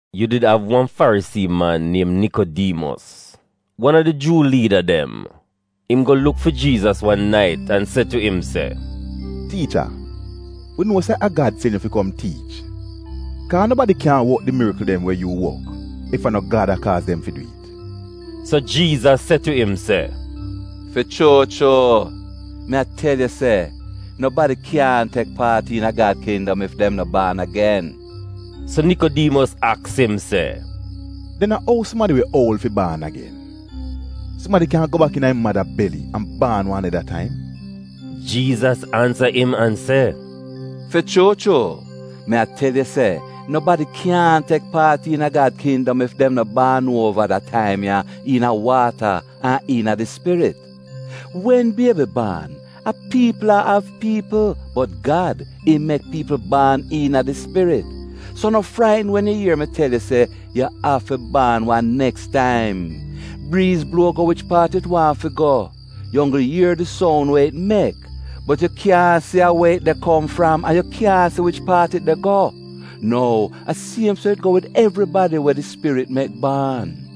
Yu did av wan Farisii man niem Nikodiimos, wan a di Juu liida dem. Im go luk fi Jiizas wan nait an se tu im se, “Tiicha, wi nuo se a Gad sen yu fi kom tiich, kaa nobadi kyaahn wok di mirikl dem we yu wok, ef a no Gad a kaaz dem fi dwi'it.” So, Jiizas se tu im se, “Fi chuu chuu, mi a tel yu se nobadi kyaahn tek paat iina Gad kindom ef dem no baan agen.” So Nikodiimos aks im se, “Den a ou sumadi we oul fi baan agen? Sumadi kyan go bak iina im mada beli an baan wan neda taim?” Jiizas ansa im an se, “Fi chuu chuu, mi a tel yu se nobadi kyaahn tek paat iina Gad kindom ef dem no baan uova da taim ya iina waata an iina di Spirit. Wen biebi baan, a piipl a av piipl, bot Gad, im mek piipl baan iina di Spirit. So no fraitn wen yu ier mi tel yu se, ‘Yu afi baan wan neks taim.’ Briiz bluo go wich paat it waahn fi go. Yu onggl ier di soun we it mek, bot yu kyaahn si a we it de kom fram an yu kyaahn si wich paat it de go. Nou, a siem so it go wid evribadi we di Spirit mek baan.”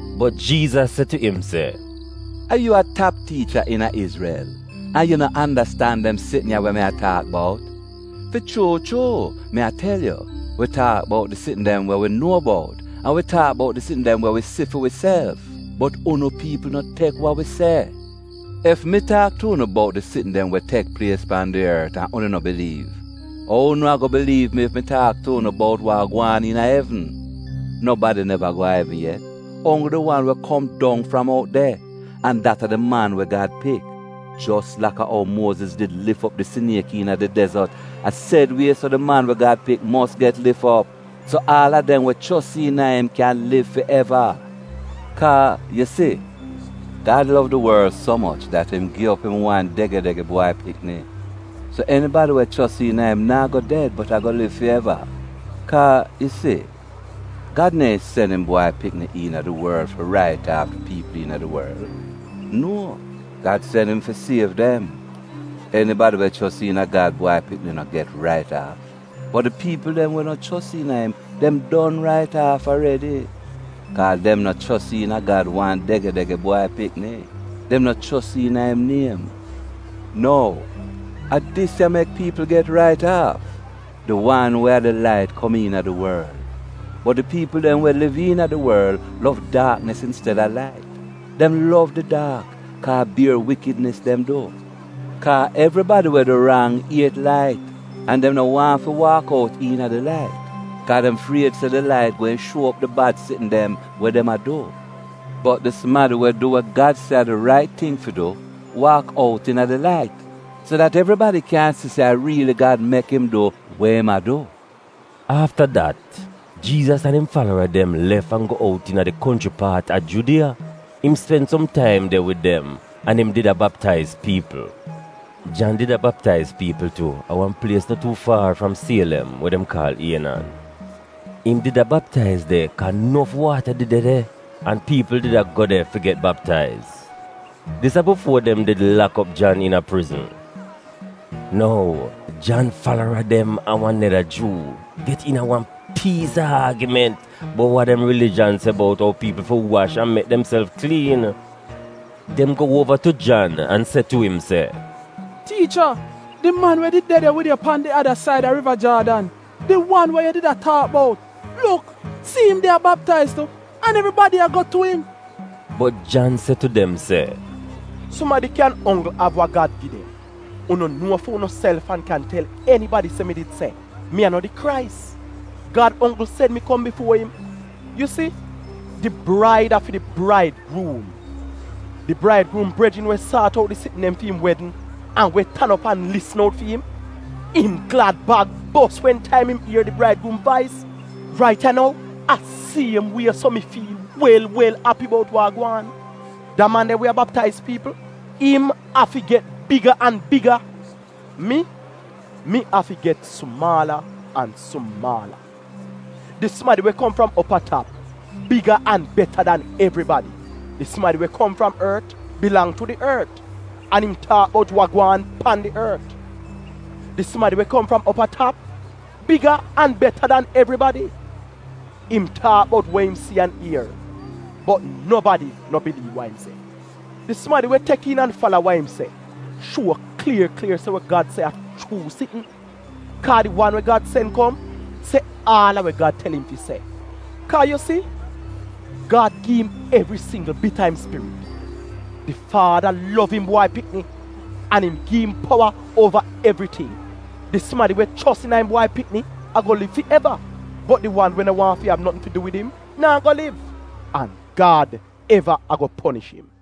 Bot, Jiizas se tu im se, “A yu a tap tiicha iina Izrel, an yu no andastan dem sitn ya we mi a taak bout? Fi chuu chuu, mi a tel yu: wi taak bout di sitn dem we wi nuo bout, an wi taak bout di sitn dem we wi si fi wiself, bot unu piipl no tek wa wi se. Ef mi taak tu unu bout di sitn dem we tek plies pan di ort an unu no biliiv, ou unu ago biliiv mi ef mi taak tu unu bout wa gwaan iina evn? Nobadi neva go a evn yet — onggl di wan we kom dong fram out de. An dat a di Man we Gad Pik. Jos laka ou Muoziz did lif op di siniek iina di dezot, a sed wie so di Man we Gad Pik mos get lif op, so aal a dem we chos iina im kyan liv fi eva.” Kaa, yu si, Gad lov di worl so moch dat im gi op im wan dege-dege Bwai Pikni, so enibadi we chos iina im naa go ded bot ago liv fi eva. Kaa yu si, Gad neehn sen im Bwai Pikni iina di worl fi rait aaf di piipl iina di worl. Nuo! Gad sen im fi siev dem. Enibadi we chos iina Gad Bwai Pikni no get rait aaf, bot di piipl dem we no chos iina im, dem don rait aaf aredi, kaa dem no chos iina Gad wan dege-dege Bwai Pikni; dem no chos iina im niem. Nou, a dis ya mek piipl get rait aaf: di wan we a di lait kom iina di worl, bot di piipl dem we liv iina di worl lov daaknis insteda lait. Dem lov di daak, kaa a bier wikidnis dem du. Kaa evribadi we du rang iet lait an dem no waahn fi waak out iina di lait, kaa dem fried se di lait gweehn shuo op di bad sitn dem we dem a du. Bot di sumadi we a du wa Gad se a di rait ting fi du, waak out iina di lait, so dat evribadi kyan si se a riili Gad mek im du we im a du.” Afta dat, Jiizas an im falara dem lef an go out iina di konchri paat a Judiya. Im spen som taim de wid dem an im did a baptaiz piipl. Jan did a baptaiz piipl tu a wan plies no tuu faar fram Sielem we dem kaal Ienan. Im did a baptaiz de, kaa nof waata did de de, an piipl did a go de fi get baptaiz. (Dis a bifuo dem did lak op Jan iina prizn.) Nou, Jan falara dem an wan neda Juu get iina wan piis a aagiment bout wa dem rilijan se bout ou piipl fi wash an mek demself kliin. Dem go uova tu Jan an se tu im se, “Tiicha, di man we did de de wid yu pan di ada said a Riva Jaadn — di wan we yu did a taak bout — luk, si'im de a baptaiz tu, an evribadi a go tu im.” Bot Jan se tu dem se, “Sumadi kyan onggl av wa Gad gi dem. Unu nuo fi unuself an kyan tel enibadi se mi did se, ‘Mi a no di Krais. Gad onggl sen mi kom bifuo im.’ Yu si, di braid a fi di braidgruum. Di braidgruum brejrin we saat out di sitn dem fi'im wedn an we tan op an lisn out fi'im, im glad-bag bos wen taim im ier di braidgruum vais. Rait ya nou, a siem wie so mi fiil wel wel api bout wa a gwaan. Da man de we a baptaiz piipl, im afi get biga an biga. Mi, mi afi get sumaala an sumaala. “Di sumadi we kom fram op a tap, biga an beta dan evribadi. Di sumadi we kom fram ort bilang tu di ort, an im taak bout wa gwaan pan di ort. Di sumadi we kom fram op a tap, biga an beta dan evribadi. Im taak bout we im si an ier, bot nobadi no biliiv wa im se. Di sumadi we tek iin an fala wa im se shuo klier klier se wa Gad se a chuu sitn. Kaa, di wan we Gad sen kom se aal a wa Gad tel im fi se, kaa yu si, Gad gi'im evri singgl bit a im Spirit. Di Faada lov im Bwai Pikni, an im gi im powa uova evriting. Di sumadi we chos iina im Bwai Pikni ago liv fi eva, bot di wan we no waahn fi av notn fi du wid im naa go liv, an Gad eva ago ponish im.”